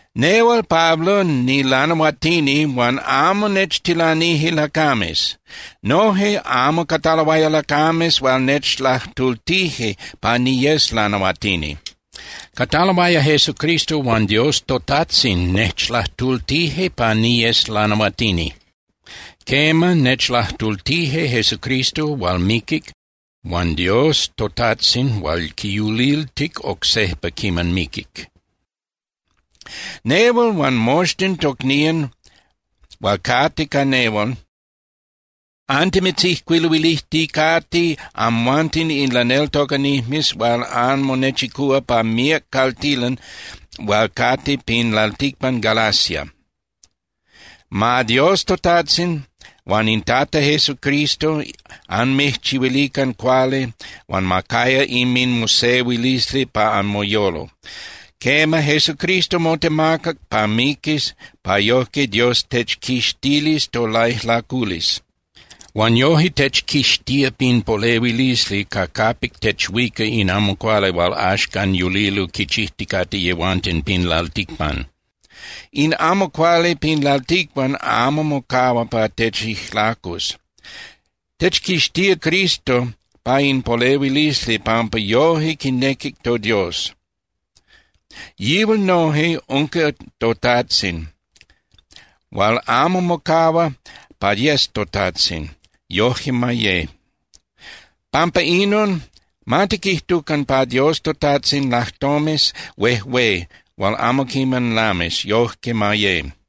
Nehual Pablo, nilanahuatini huan amo nechtilanije lacames. Noje amo cataloaya lacames hual nechlajtultije pa niyes lanahuatini. Cataloaya Jesucristo huan Dios toTajtzin nechlajtultije pa niyes lanahuatini. Quema, nechlajtultije Jesucristo hual miquic huan Dios toTajtzin hual quiyuliltic oc sejpa quiman miquic. Nehual huan moxtin tocnían hual cate ca nehual, antimitzijcuiluilijticate amhuanten in laneltocanijmes hual anmonechicúa pa míac caltilan hual cate pin lalticpan Galacia. Ma Dios toTajtzin huan in Tata Jesucristo anmijchihuilican cuali huan ma caya inminmosehuilisli pa anmoyolo. Quema, Jesucristo motemacac pa miquis pa yojque Dios techquixtilis tolaijlaculisli. Huan yoje techquixtía pin polehuilisli ca capic techuica in amo cuali hual axcan yulilo quichijticate yehuanten pin lalticpan. In amo cuali pin lalticpan amo mocahua pa techijlacus. Techquixtía Cristo pa in polehuilisli pampa yoje quinequic toDios. Yihual noje unca toTajtzin hual amo mocahua pa yes toTajtzin, yojque ma ye. Pampa inon, ma tiquijtucan pa Dios toTajtzin lajtomes huejué hual amo quiman lamis, yojque ma ye.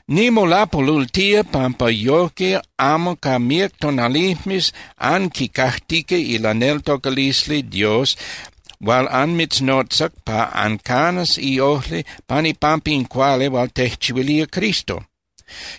Nimolapolultía pampa yojque amo ca míac tonalijmes anquicajtica ilaneltocalisli Dios hual anmitznotzac pa ancanas iojli pan ipampa in cuali hual tejchihuilía Cristo.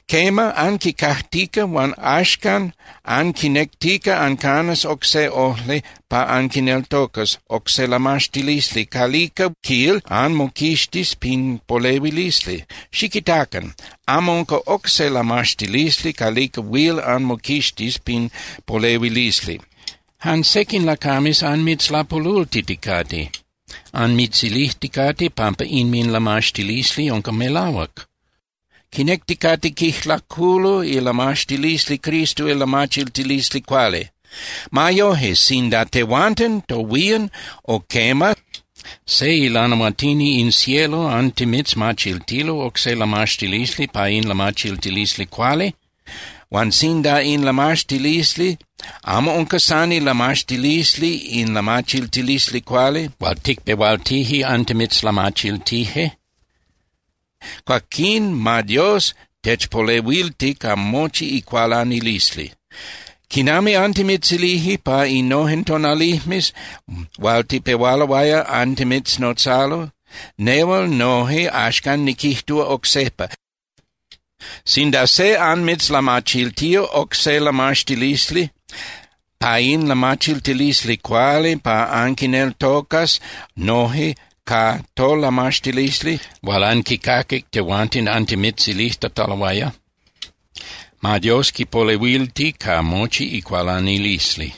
Quema, anquicajtica huan axcan anquinectica ancanas oc se ojli pa anquineltocas oc se lamaxtilisli calica, quil, anmoquixtis pin polehuilisli. Xiquitacan. Amo unca oc se lamaxtilisli calica huil anmoquixtis pin polehuilisli. Jan sequin lacames anmitzlapolultiticate. Anmitzilijticate pampa inminlamaxtilisli unca melahuac. Quinecticate quijlaculo ilamaxtilisli Cristo ilamachiltilisli cuali. Ma yoje, sinda tehuanten tohuían o quema, se ilanahuatini in cielo antimitzmachiltilo oc se lamaxtilisli pa in lamachiltilisli cuali, huan sinda in lamaxtilisli amo unca san ilamaxtilisli in lamachiltilisli cuali hual ticpehualtije antimitzlamachiltije, cuaquín ma Dios techpolehuilti ca mochi icualanilisli. Quinami antimitzilije pa innojen tonalijmes hual tipehualoaya antimitznotzalo, nehual noje axcan niquijtúa oc sejpa: Sinda se anmitzlamachiltía oc se lamaxtilisli pa in lamachiltilisli cuali pa anquineltocas noje ca tolamaxtilisli hual anquicaquic tehuanten antimitzilijtataloaya, ma Dios quipolehuilti ca mochi icualanilisli.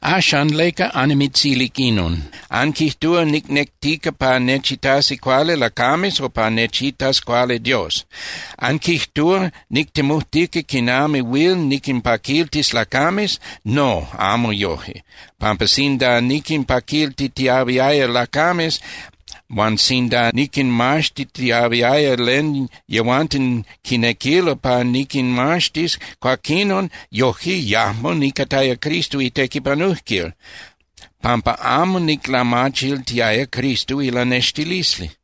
Axan, ¿leca annimitzilic inon? ¿Anquijtúa nicnectica pa nechitasi cuali lacames o pa nechitas cuali Dios? ¿Anquijtúa nictemujtica quinami huil niquinpaquiltis lacames? No, amo yoje, pampa sinda niquinpaquiltitiahuiaya lacames, huan sinda niquinmaxtitiahuiaya len yehuanten quinequilo pa niquinmaxtis, cuaquinon yojque yajmo nicataya Cristo itequipanujquil, pampa amo niclamachiltiaya Cristo ilanextilisli.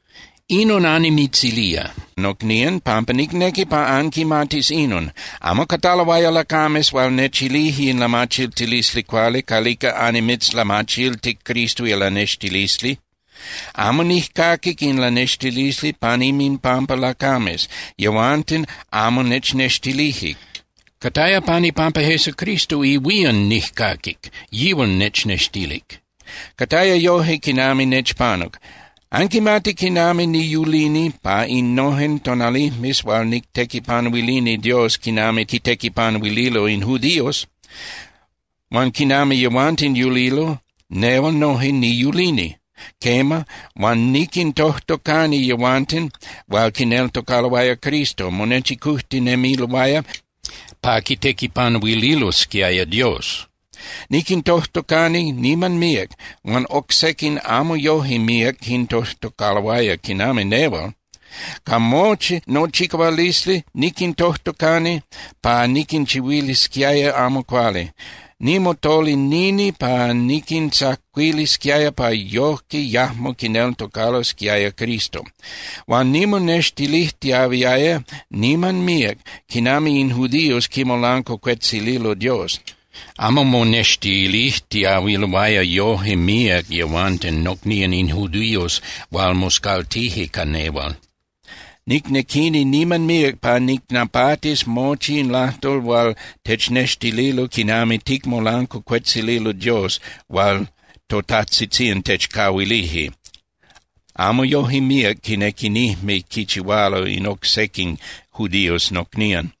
Inon annimitzilía, nocnían, pampa nicnequi pa anquimatis inon. Amo cataloaya lacames hual nechilije in lamachiltilisli cuali calica annimitzlamachiltic Cristo ilanextilisli. Amo nijcaquic in lanextilisli pan inminpampa lacames, yehuanten amo nechnextilije. Cataya pan ipampa Jesucristo ihuían nijcaquic, yihual nechnextilic. Cataya yoje quinami nechpanuc: Anquimatic quinami niyulini pa innojen tonalijmes hual nictequipanuilini Dios quinami quitequipanuililo in judíos. Huan quinami yehuanten yulilo, nehual noje niyulini. Quema, huan niquintojtocani yehuanten hual quineltocaloaya Cristo monechicujtinemiloaya pa quitequipanuililosquiaya Dios. Niquintojtocani niman míac, huan oc sequin amo yoje míac quintojtocaloaya quinami nehual. Ca mochi nochicahualisli niquintojtocani pa niquinchihuilisquiaya amo cuali. Nimotolinini pa niquintzacuilisquiaya pa yojque yajmo quineltocalosquiaya Cristo. Huan nimonextilijtiahuiaya niman míac quinami in judíos quimolancuacuetzililo Dios. Amo monextilijtiahuiloaya yoje míac yehuanten nocnían in judíos hual moscaltije ca nehual. Nicnequini niman míac pa nicnapatis mochi in lajtol hual technextililo quinami ticmolancuacuetzililo Dios hual totajtzitzían techcahuilije, amo yoje míac quinequinijme quichihualo in oc sequin judíos nocnían.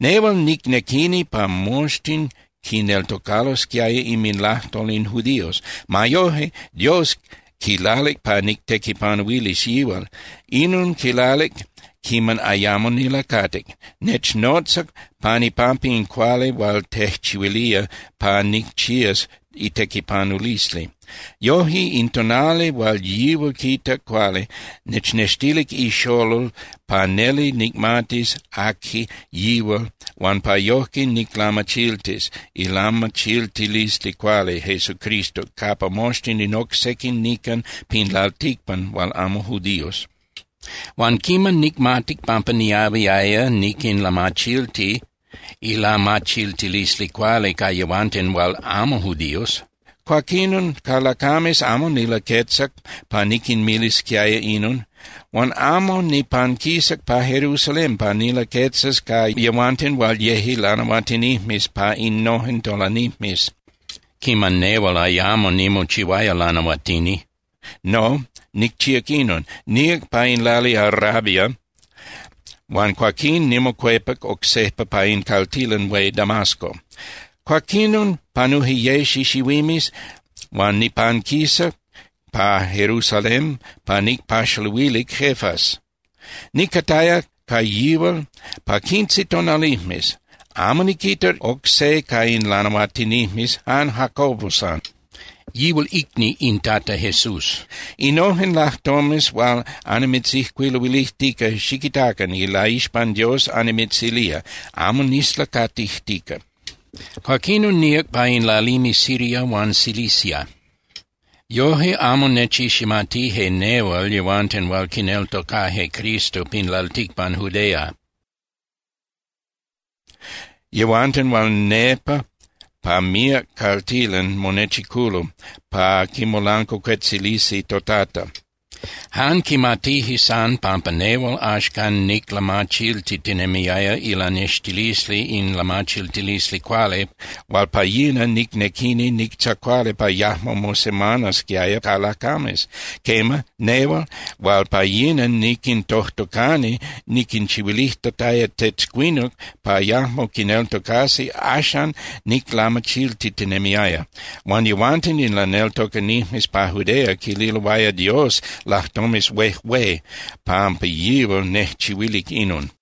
Nehual nicnequini pa moxtin quineltocalosquiaya inminlajtol in judíos. Ma yoje, Dios quilalic pa nictequipanuilis yihual. Inon quilalic quiman ayamo nilacatic. Nechnotzac pan ipampa in cuali hual tejchihuilía pa nicchías itequipanulisli. Yoje, in tonali hual yihual quitac cuali, nechnextilic iXolol pa neli nicmatis aqui yihual huan pa yojque niclamachiltis ilamachiltilisli cuali Jesucristo capa moxtin in oc sequin nican pin lalticpan hual amo judíos. Huan quiman nicmatic pampa niahuiaya niquinlamachilti ilamachiltilisli cuali ca yehuanten hual amo judíos, cuaquinon ca lacames amo nilaquetzac pa niquinmilisquiaya inon. Huan amo nipanquisac pa Jerusalén pa nilaquetzas ca yehuanten hual yeje lanahuatinijmes pa innojen tonalijmes quiman nehual ayamo nimochihuaya lanahuatini. No, nicchíac inon: Níac pa in lali Arabia huan cuaquín nimocuepac oc sejpa pa in caltilan hué Damasco. Cuaquinon panuje ye xixihuimes, huan nipanquisac pa Jerusalén pa nicpaxaluilic Cefas. Nicataya ca yihual pa quince tonalijmes. Amo niquitac oc se ca in lanahuatinijmes, jan Jacobo san, yihual icni in Tata Jesús. Innojen lajtomes hual annimitzijcuiluilijtica, xiquitacan, ilaixpan Dios annimitzilía, amo nislacatijtica. Cuaquinon níac pa in lalimes Siria huan Cilicia. Yoje amo nechiximatije nehual yehuanten hual quineltocaje Cristo pin lalticpan Judea, yehuanten hual nepa pa míac caltilan monechiculo pa quimolancuacuetzilisi toTata. Jan quimatije san pampa nehual axcan niclamachiltitinemiaya ilanextilisli in lamachiltilisli cuali hual pa yina nicnequini nictzacuali pa yajmo mosemanasquiaya ca lacames. Quema, nehual hual pa yina niquintojtocani niquinchihuilijtataya tetzcuinuc pa yajmo quineltocasi axan niclamachiltitinemiaya. Huan yehuanten in laneltocanijmes pa Judea quililoaya Dios lajtomes huejué pampa yihual nejchihuilic inon.